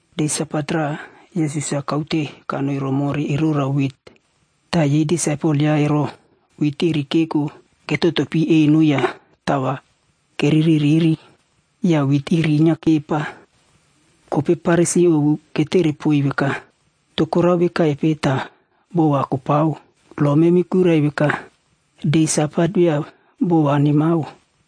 De Sabat raꞌa, Yesus-a kaute kanoi romore erora wit. Ta yei disaipel yaꞌa ero, wit iri keko ya ketotopi eno ya tao va kereririri ya wit iri inyia kepa. Kopei Farisi ovu ketere poiy veka, “To korao vekaipe ta boꞌo va kopao, lo memi kuirai veka de Sabat via boꞌo va nemao,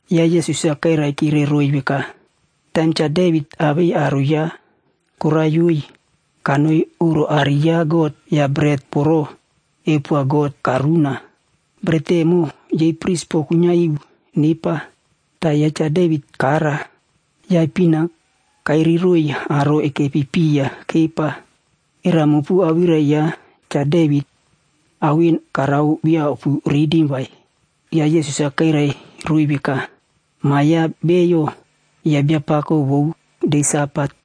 Ya Yesus-a kairaikire roiy veka, “Taim Cha Devit awei aro yaꞌa koraiyoe, kanoi oꞌro aꞌari ya God ya beret voro keupoa God karuna. Beret emo, yei pris po kuinyia iu nepa, ta Cha Devit kara. Ya ipin-a karoiy aro ekepi piya kepa. Era mopu awirai ya Cha Devit ao en karao via opuritim vai?” Ya Yesus-a kairai roiy veka, “Ma ya Bio, yaꞌa Biapako vou de Sabat.”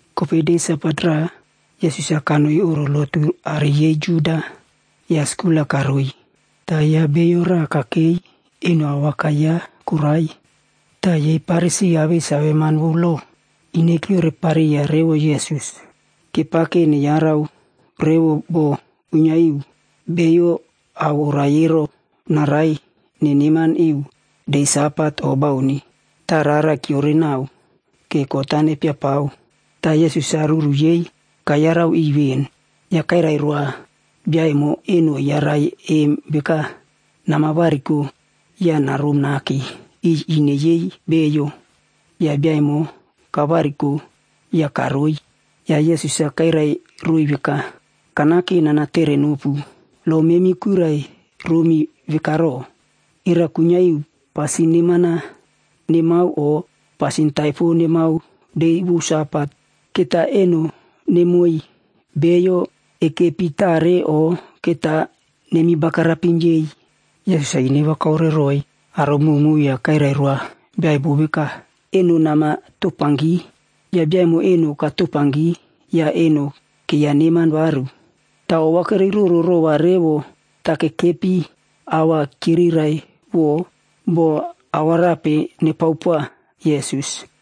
Kopei de Sabat raꞌa Yesus-a kanoi oꞌro lotu aꞌari yei Juda ya skul-a karoiy. Ta ya bio raꞌa kakei, eno awakai yaꞌa korai. Ta yei Farisi awei saveman vou lob ine kyiorepariya revo Yesus. Kepake neyarau revo bo kuinyia iu beiyo a oraie ero naraie neneman iu de Sabat o bauni. Ta rara kyiorenanao ke kot-a nepiapao. Ta Yesus-a ruru yei kayarau iꞌiy ven. Ya kairai roa bia emo eno eyarai em veka, “Namavariko ya narom nake iꞌiy ine yei beiyo.” Ya bia emo kavariko ya karoi. Ya Yesus-a kairai roiy veka, “Kanake nanatere nopu, lo memi kuirai romi veka ro, era kuinyia iu pasin neman-a nemao o pasin taipo nemao de vou Sabat? Keta eno nemoiy beiyo ekepi tare o keta nemi bagarapim yei?” Yesus-a ine va kaore roiy aro mowmow ya kairai roa bia emo veka, “Eno namatopanki.” Ya bia emo eno katopanki ya eno keiyaneman varu. Ta ova keiyaroro rova revo ta kekepi awirai-ya kyirirai bo ao arape nepao poa Yesus.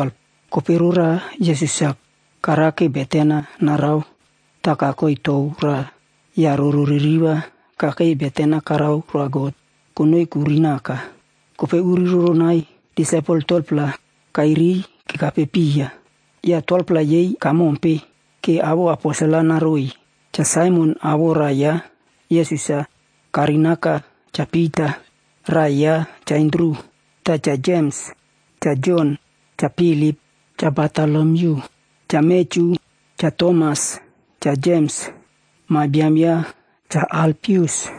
Kopei roraꞌa Yesus-a karake beten-a narao ta kakoi tou raꞌa ya roro ririva kakei beten-a karao roa God konoi kuri naka. Kopei uri roronai disaipel 12-pla kairiy kekape piya. Ya 12-pla yei kamompe, ke awoꞌo aposel-ac naroiy: Cha Saimon awoꞌo raꞌa yaꞌa, Yesus-a karinaka Cha Pita. Raꞌai ya Cha Andru ta Cha Jems, Cha Jon, Cha Pilip, Cha Bartolomyu, Cha Matyu, Cha Tomas, Cha Jems ma biam ya Cha Alfius,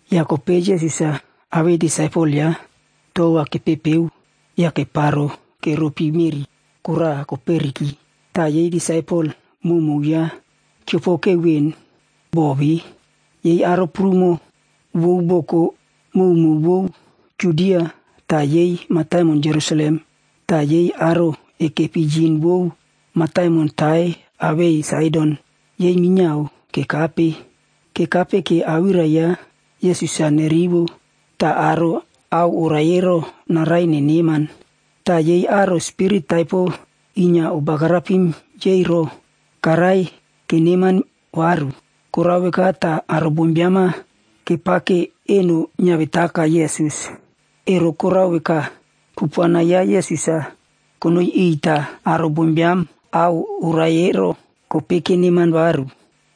Ya kopei Yesus-a awei disaipel yaꞌa tou va kepepeo ya keparo keropi meꞌri koraꞌa koperiki, ta yei disaipel mowmow yaꞌa kyiopoke ven bo ve. Yei aro prumo vou boko mowmow vou Judia ta yei mataimon Jerusalem ta yei aro ekepi yine vou mataimon Tair awei Saidon, yei minyiao kekape. Kekape ke awirai ya Yesus-a nerivo ta aro a oraie ero naraie neneman. Ta yei aro spirit taipo inyia obagarapim yei ero, karaie keneman varu. Korao veka ta aro bombiam-a kepake eno nyiavetaka Yesus, ero korao veka, kupuana ya Yesus-a konoi iꞌiy ta aro bombiam a oraie ero kopei keneman varu.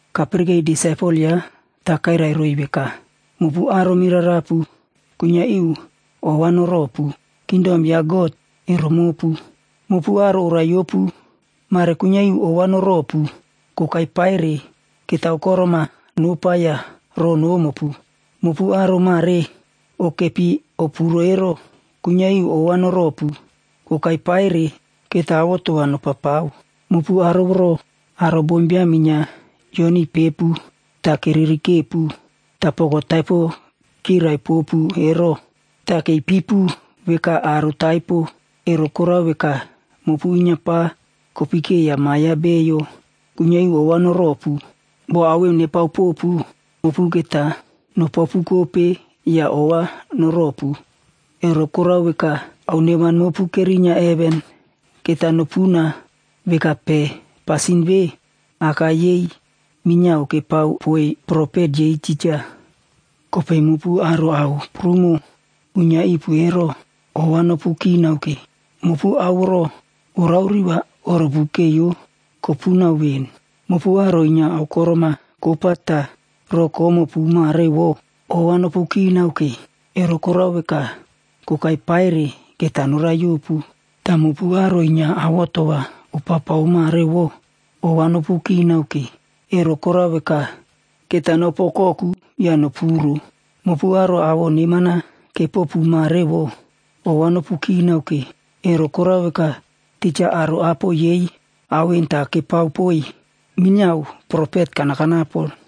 Kapirikei disaipel yaꞌa ta kairai roiy veka, “Mopu aro mirarapu, kuinyia iu ova noropu. Kingdom ya God, ero mopu. Mopu aro oraiyopu, mare kuinyia iu ova noropu, kokai paire keta aokorom-a nopa ya roꞌo nomopu. Mopu aro mare okepi opuro ero, kuinyia iu ova noropu, kokai paire keta avoto va nopapao. Mopu aro voro aro bombiam inyia kyionipepu ta keririkepu, ta poko taipo kyirai popu ero, ta keipipu veka aro taipo, ero korao veka, mopu inyia pa kopikeiya Ma ya Bio, kuinyia iu ova noropu. “Bo ao en nepao popu, mopu keta nopaopukope ya ova noropu. Ero korao veka, ao neman mopu kerinyia heven keta nopuna veka pe. Pasin ve, aka yei minyiao kepao poiy profet yei tija. Kopei mopu aro ao prumo uinyia ipu ero, ova nopu kinao ke. Mopu ao voro norao riꞌi va norupukeiyo kopuko ven. Mopu aro inyia aokorom-a kopa ta roꞌo komopu mare voꞌo, ova nopukinao ke. ero korao veka, kokai paire keta noraiyopu. Ta mopu aro inyia avoto va opapao mare vo, ova nopukinao ke, ero korao veka, keta nopu okoku ya nopuro. Mopu aro awoꞌo neman-a kepopu mare vo, ova nopukinao ke, ero korao veka, tija aro apo yei ao en ta kepao poiy minyiao profet kanakanapo.”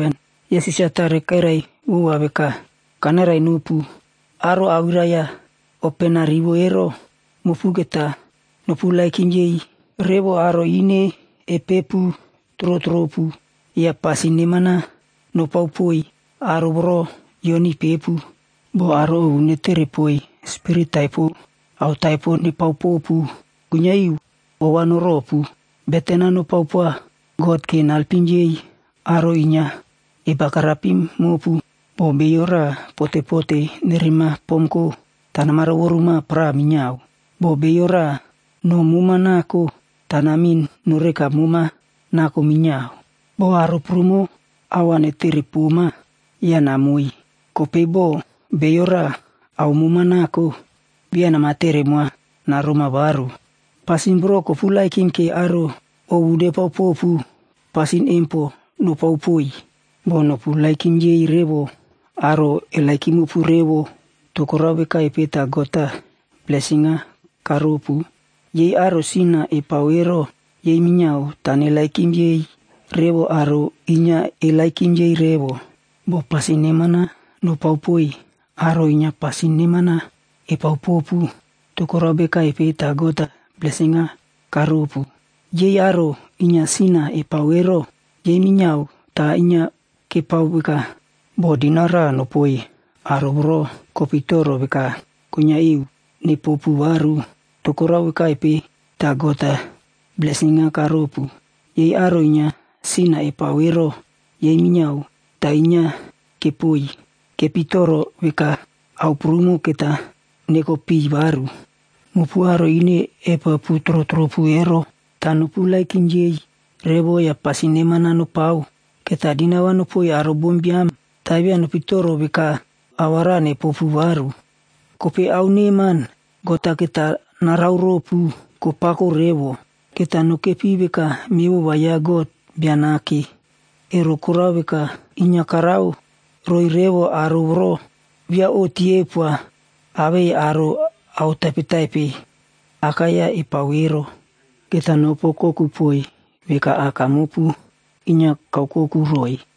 Yesus-a tare kairai vova veka, “Kanairai nopu, aro awirai-ya opena rivo ero, mopu keta noperepoiy revo aro ine epepu trotropu ya pasin neman-a nopao poiy aro voro kyionipepu. Bo aro ovu netere poiy spirit taipo ao taipo nepao popu, kuinyia iu ova noropu. Beten-a nopao poa God ke nalpim yei aro inyia ebagarapim mopu. Bo bio raꞌa potepote nerema pomko, ta namarovoru moa para minyiao. Bo bio raꞌa no moma nako, ta namin noreka moma nako minyiao. Bo aro prumo ao va netere poma, namoiy. Kopei bo bio raꞌa ao mema nako, via namatere moa naroma varu vai. Pasin voro koperepow ke aro ovu nepao popu, pasin em po nopao poiy. “Bo noperepoiy revo aro eperepopu revo, to korao vekaipe ta God-a blesin-a karopu? Yei aro sin-a epao ero yei minyiao ta neperepoiy revo aro inyia eperepoiy revo. Bo pasin neman-a nopao poiy aro inyia pasin neman-a epao popu, to korao vekaipe ta God-a blesin-a karopu? Yei aro inyia sin-a epao ero yei minyiao ta inyia kepao veka. Bo dinau raꞌa nopoiy aro voro kopitoro veka kuinyia iu nepopu varu, to korao vekaipe ta God-a blesin-a karopu? Yei aro inyia sin-a epao ero, yei minyiao ta inyia kepoiy. Kepitoro veka ao prumo keta neko piy varu. Mopu aro ine epepu trotropu ero ta noperepoiy revo ya pasin neman-a nopao. Keta dinau va nopoiy aro bombiam ta via nopitoro veka ao va raꞌa nepopu varu. Kopei ao neman God-a keta narao ropu, kopako revo. Keta nokepi veka mevova ya God Bia Nake. Ero korao veka, inyia karao roiy revo aro voro via oꞌti eupoa awei aro ao taipetaipe akai-ya epao ero. Keta nopu okoku poiy veka Aka mopu inyia kaokoku roiy.”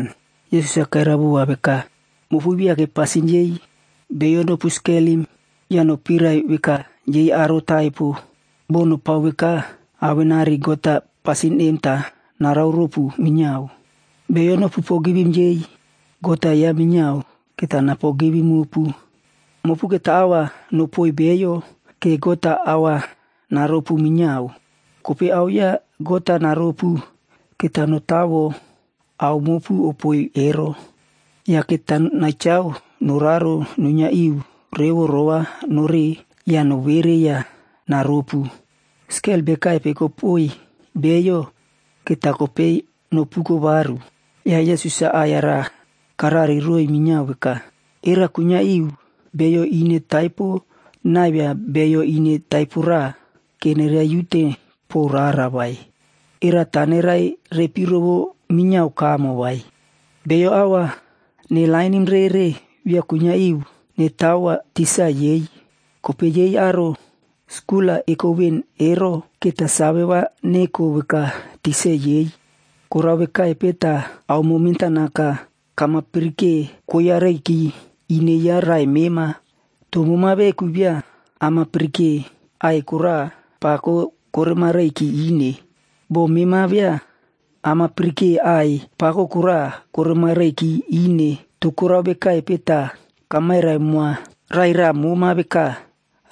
Yesus-a kairai vova veka, “Mopu viake pasin yei beiyo nopu skelim ya nopirai veka yei aro taipo, bo nopao veka, awenari God-a pasin em ta narao ropu minyiao. Beiyo nopu pogivim yei, God-a yaꞌa minyiao keta napogivim mopu. Mopu keta ao va nopoiy beiyo ke God-a ao va naropu minyiao. Kopei ao ya God-a naropu, keta notawo ao mopu opoiy ero, ya keta nachao noraro nuinyia iu revo rovanore ya novere ya naropu. Skel bekaipe kopoiy beiyo, keta kopei nopuko varu.” Ya Yesus-a aꞌai-ya karari roiy minyiao veka, “Era kuinyia iu bio ine taipo naivia bio ine taipo raꞌa ke neraiute po rara vai? Era ta nerairepi rovo minyiao kamo vai? Beiyo ao va nelainim rere via kuinyia iu netawo tikse yei, kopei yei aro skul-a eko ven ero, keta save va neko veka tikse yei. “Korao vekaipe ta aomo mentanaka kamapirike koiyareiki ine ya raꞌai mema. To mema veku via amapirike aꞌai koraꞌa pako koremareiki ine? Bo mema via amapirike aꞌai pako koraꞌa koremareiki ine, to korao vekaipe ta kamairai moa raꞌai raꞌa moma veka,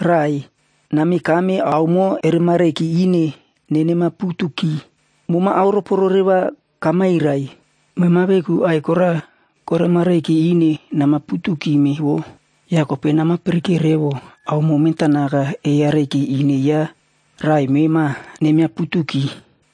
‘Raꞌai, nameka aomo eremareiki ine nenemaputuki.’ Mema aoroporere va kamairai, mema veku aꞌai kora koremareiki ine namaputukime vo. Ya kopei namapirikeo revo aomo mentanaka eyareiki ine ya raꞌai mema nemiaputuki.”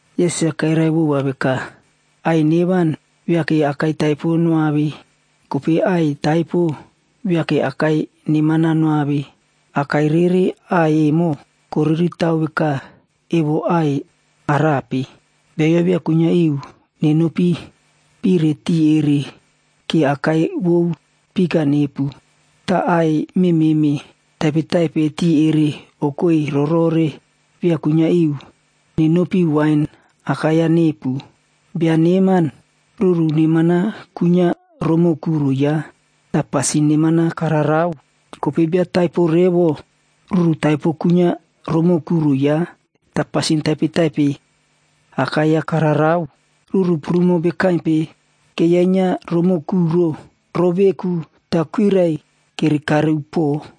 Yesus-a kairai vova veka, “Aꞌai neman viake akai taipo noave, kopei aꞌai taipo viake akai neman-a noave. Akai rere aꞌai emo, koriritao veka evo aꞌai arape. Beiyo via kuinyia iu nenopi pire tiꞌi ere ke akai vou fik-a nepu, ta aꞌai mememe taipetaipe tiꞌi erere erinyia ero via kuinyia iu nenopi wain akai-ya nepu. Bia neman ruru akai-ya kuinyia iꞌya romoꞌo kuro yaꞌa ta pasin neman-a kararao. Kopei bia ataipo revo, ruru taipo awakai-ya kuinyia iꞌya romoꞌo kuro yaꞌa ta pasin taipetaipe akai-ya kararao. Ruru prumo vekaipe kerinyia romoꞌo kuro, roꞌo veku ta kuirai kerekare upuo.”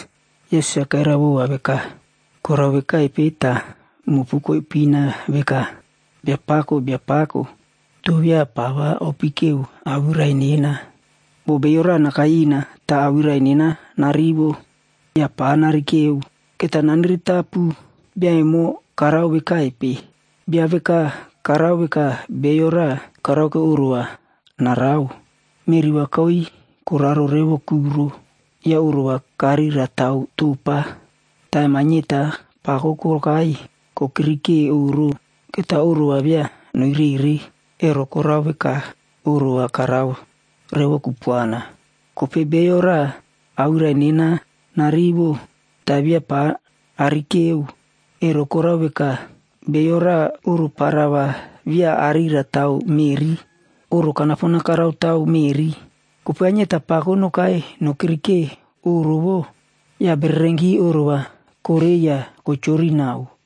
Yesus-a kairai vova veka, “Korao vekaipe ta mopu koipina veka, ‘Biapako, Biapako,’ ta via pa va opikeo awirai nena? Bo bio raꞌa nakai ina ta awirai nena narivo ya pa narikeo, keta naniritapu bia emo karao vekaipe. “Bia veka karao veka bio raꞌa karake oꞌro va narao. Meꞌri va kaui koraro revo kuro ya oꞌro va karira tao topa. Taim ainyeta pako nokai nokirike oꞌro, keta oꞌro va via noirere, ero korao veka oꞌro va karao revo kupuana. Kopei bio raꞌa awirai nena narivo ta via pa narikeo, ero korao veka, bio raꞌa oꞌro para va via arira tao meꞌri. Oꞌro karaotao pon meꞌri. Kopei ainyeta pako nokai nokirike oꞌro vo, ya bererenki oꞌro va korei ya kochori nau.”